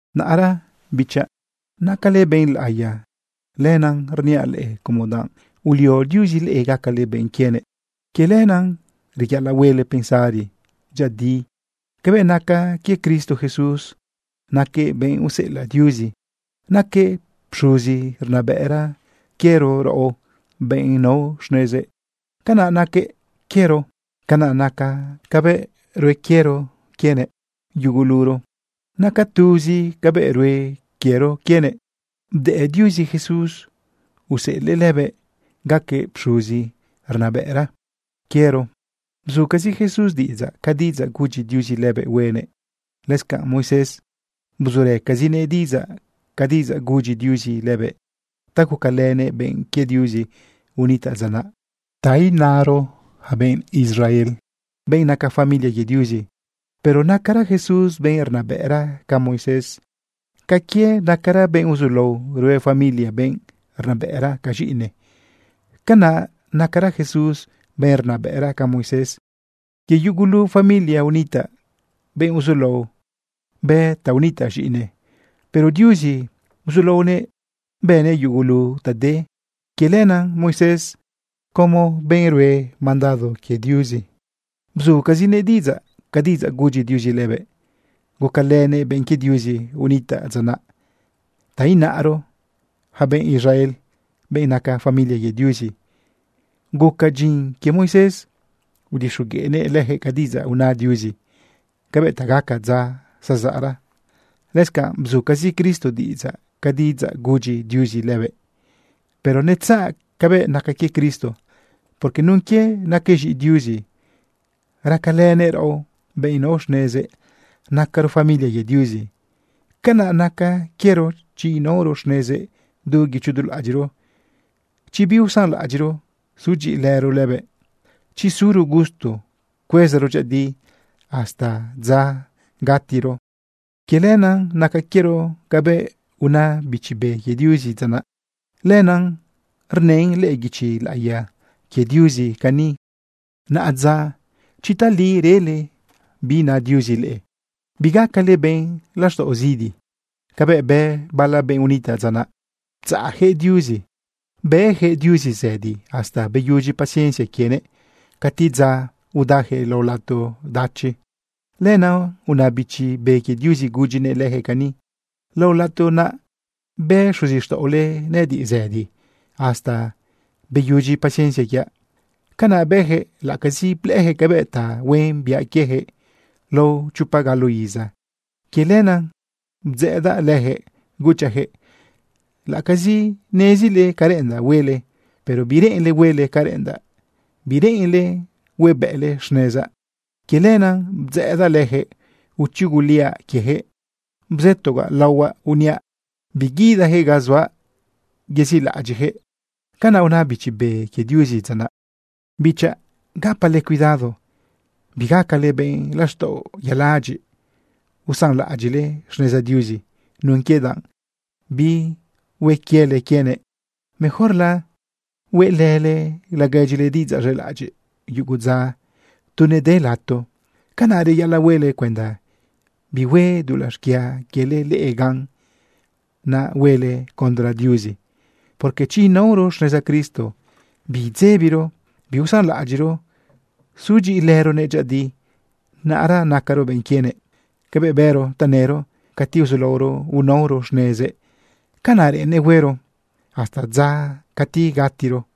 Naꞌra, bichaꞌ, nacale benꞌ laꞌiya. Lenaꞌ rniaꞌ leꞌe como danꞌ ulio Diuzi leꞌe gacale benꞌ quienëꞌ. Quie lenaꞌ reyaꞌalaꞌ huele pensari dyëꞌëdi cabëꞌ naca quie Cristo Jesús. Naquëꞌ benꞌ useꞌelaꞌ Diuzi. Naquëꞌ pxuzi rnabëꞌra quiero raꞌo benꞌ nao xnezëꞌ. Canaꞌ naquëꞌ quiero. Canaꞌ naca cabëꞌ rue quiero quienëꞌ yuguluro, naca tuzi cabëꞌ rue quiero quienëꞌ. Bdëꞌ Diuzi Jesús useꞌelëꞌ lëbëꞌ gaquëꞌ pxuzi rnabëꞌra quiero. Bzucazi Jesús diꞌidzaꞌ ca diꞌidzaꞌ gudyi Diuzi lëbëꞌ huenëꞌ. Lëscanꞌ Moisés, bzurëcazinëꞌ diꞌidzaꞌ ca diꞌidzaꞌ gudyi Diuzi lëbëꞌ ta gucalënëꞌ benꞌ quie Diuzi unitaꞌ dza naꞌ, ta inaro, yaca benꞌ Israel, benꞌ naca familia quie Diuzi. Pero nacara Jesús benꞌ rnabëꞌra ca Moisés. Ca quie nacara benꞌ uzulao rue familia benꞌ rnabëꞌra ca z̃iꞌinëꞌ, canaꞌ nacara Jesús benꞌ rnabëꞌra ca Moisés. Quie yugulu familia unitaꞌ benꞌ uzulao bë ta unitaꞌ z̃iꞌinëꞌ. Pero Diuzi uzulaonëꞌ bënëꞌ yugulu ta de. Quie lenaꞌ Moisés, como benꞌ rue mandado quie Diuzi, bzucazinëꞌ diꞌidzaꞌ ca diꞌidzaꞌ gudyi Diuzi lëbëꞌ gucalënëꞌ benꞌ quie Diuzi unitaꞌ dza naꞌ, ta inaro, yaca benꞌ Israel, benꞌ naca familia quie Diuzi. Guca dyin quie Moisés udixogueꞌnëꞌ lëjëꞌ ca diꞌidzaꞌ una Diuzi cabëꞌ ta gaca dza zazaꞌra. Lëscanꞌ bzucazi Cristo diꞌidzaꞌ ca diꞌidzaꞌ gudyi Diuzi lëbëꞌ. Pero netzaꞌ cabëꞌ naca quie Cristo, porque nun quie naquëꞌ z̃iꞌi Diuzi racalënëꞌ raꞌo, benꞌ nao xnezëꞌ nacaro familia quie Diuzi. Canaꞌ naca quiero chi inaoro xnezëꞌ du guicho du laꞌadyiꞌro, chi biusanlaꞌadyiꞌro sudyiꞌilëro lëbëꞌ, chi suro gusto cuezaro dyëꞌëdi hasta dza gatiro. Quie lenaꞌ naca quiero cabëꞌ una Bichi Be quie Diuzi dza naꞌ. Lenaꞌ rnën lëꞌë guichi laꞌiya quie Diuzi cani: Naꞌadza, chi tali rele bi na Diuzi leꞌe, bigacale benꞌ laxtaꞌo zidi, cabëꞌ bë bala benꞌ unitaꞌ dza naꞌ ptzaꞌjëꞌ Diuzi. Bëjëꞌ Diuzi zëdi hasta beyudyi paciencia quienëꞌ, cati dza udajëꞌ lao lato dachi. Lenaꞌ una Bichi Be quie Diuzi gudyinëꞌ lëjëꞌ cani: Lao lato naꞌ bë xuzixtaꞌole nëꞌëdiꞌ zëdi hasta beyudyi paciencia quiaꞌ. Canaꞌ bëjëꞌ laꞌacazi blëꞌëjëꞌ cabëꞌ tahuen biaꞌ quiejëꞌ lao chopa galo iza. Quie lenaꞌ bdzëꞌëdaꞌ lëjëꞌ, guchaꞌ jëꞌ: “Laꞌacazi nezile ca reꞌendaꞌ huele, pero bireꞌenle huele ca reꞌendaꞌ. Bireꞌenle huebëꞌle xnezaꞌ.” Quie lenaꞌ bdzëꞌëdaꞌ lëjëꞌ uchuguliaꞌ quiejëꞌ bzëtogaꞌ laohuaꞌ uniaꞌ: “Biguidajëꞌ ga zuaꞌ yezilaꞌadyiꞌjëꞌ.” Canaꞌ una Bichi Be quie Diuzi dza naꞌ. Bichaꞌ, gapale cuidado bigacale benꞌ laxtaꞌo yaladyiꞌ usanlaꞌadyiꞌle xneza Diuzi nun quie danꞌ bihue quiele quienëꞌ. Mejorla hueꞌlële laguedyile diꞌidzaꞌ z̃elaꞌadyiꞌ yugu dza tu nede lato. Canaꞌ reyaꞌalaꞌ huele cuenda bihue dulaꞌ xquia quiele leꞌe gan, naꞌ huele condre Diuzi. Porque chi inaoro xneza Cristo biidzebiro biusanlaꞌadyiꞌro sudyiꞌilëronëꞌ dyëꞌëdi, naꞌra nacaro benꞌ quienëꞌ. Cabëꞌ bëro tanëro cati uzulaoro unaoro xnezëꞌ, canaꞌ reꞌennëꞌ huero hasta dza cati gatiro.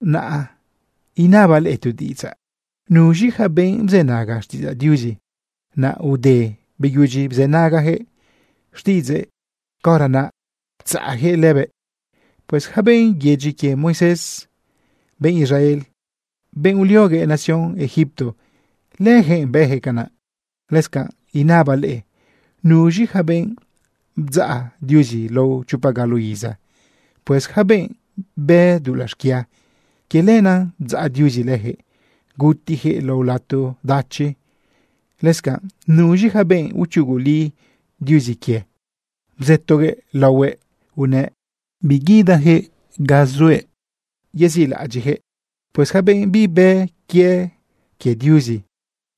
Naꞌ inabaꞌ leꞌe tu diꞌidzaꞌ. ¿Nuz̃i ja benꞌ bzënaga xtiꞌidzaꞌ Diuzi, naꞌ ude beyudyi bzënagajëꞌ xtiꞌidzëꞌ, caora naꞌ ptzaꞌjëꞌ lëbëꞌ? Pues yaca benꞌ yedyi quie Moisés, benꞌ Israel, benꞌ ulioguëꞌ nación Egipto, lëjëꞌ bëjëꞌ canaꞌ. Lëscanꞌ inabaꞌ leꞌe: ¿Nuz̃i ja benꞌ bdzaꞌ Diuzi lao chopa galo iza? Pues yaca benꞌ bë dulaꞌ xquia. Quie lenaꞌ bdzaꞌ Diuzi lëjëꞌ gutijëꞌ lao lato dachi. Lëscanꞌ, ¿nuz̃i ja benꞌ uchuguli Diuzi quie, bzëtoguëꞌ laohuëꞌ unëꞌ biguidajëꞌ ga zuëꞌ yezilaꞌadyiꞌjëꞌ? Pues yaca benꞌ bibë quie quie Diuzi,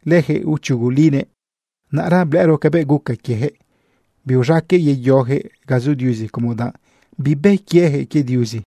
lëjëꞌ uchugulinëꞌ. Naꞌra blëꞌëro cabëꞌ guca quiejëꞌ biuz̃aqueꞌ yeyojëꞌ ga zu Diuzi como danꞌ bibë quiejëꞌ quie Diuzi.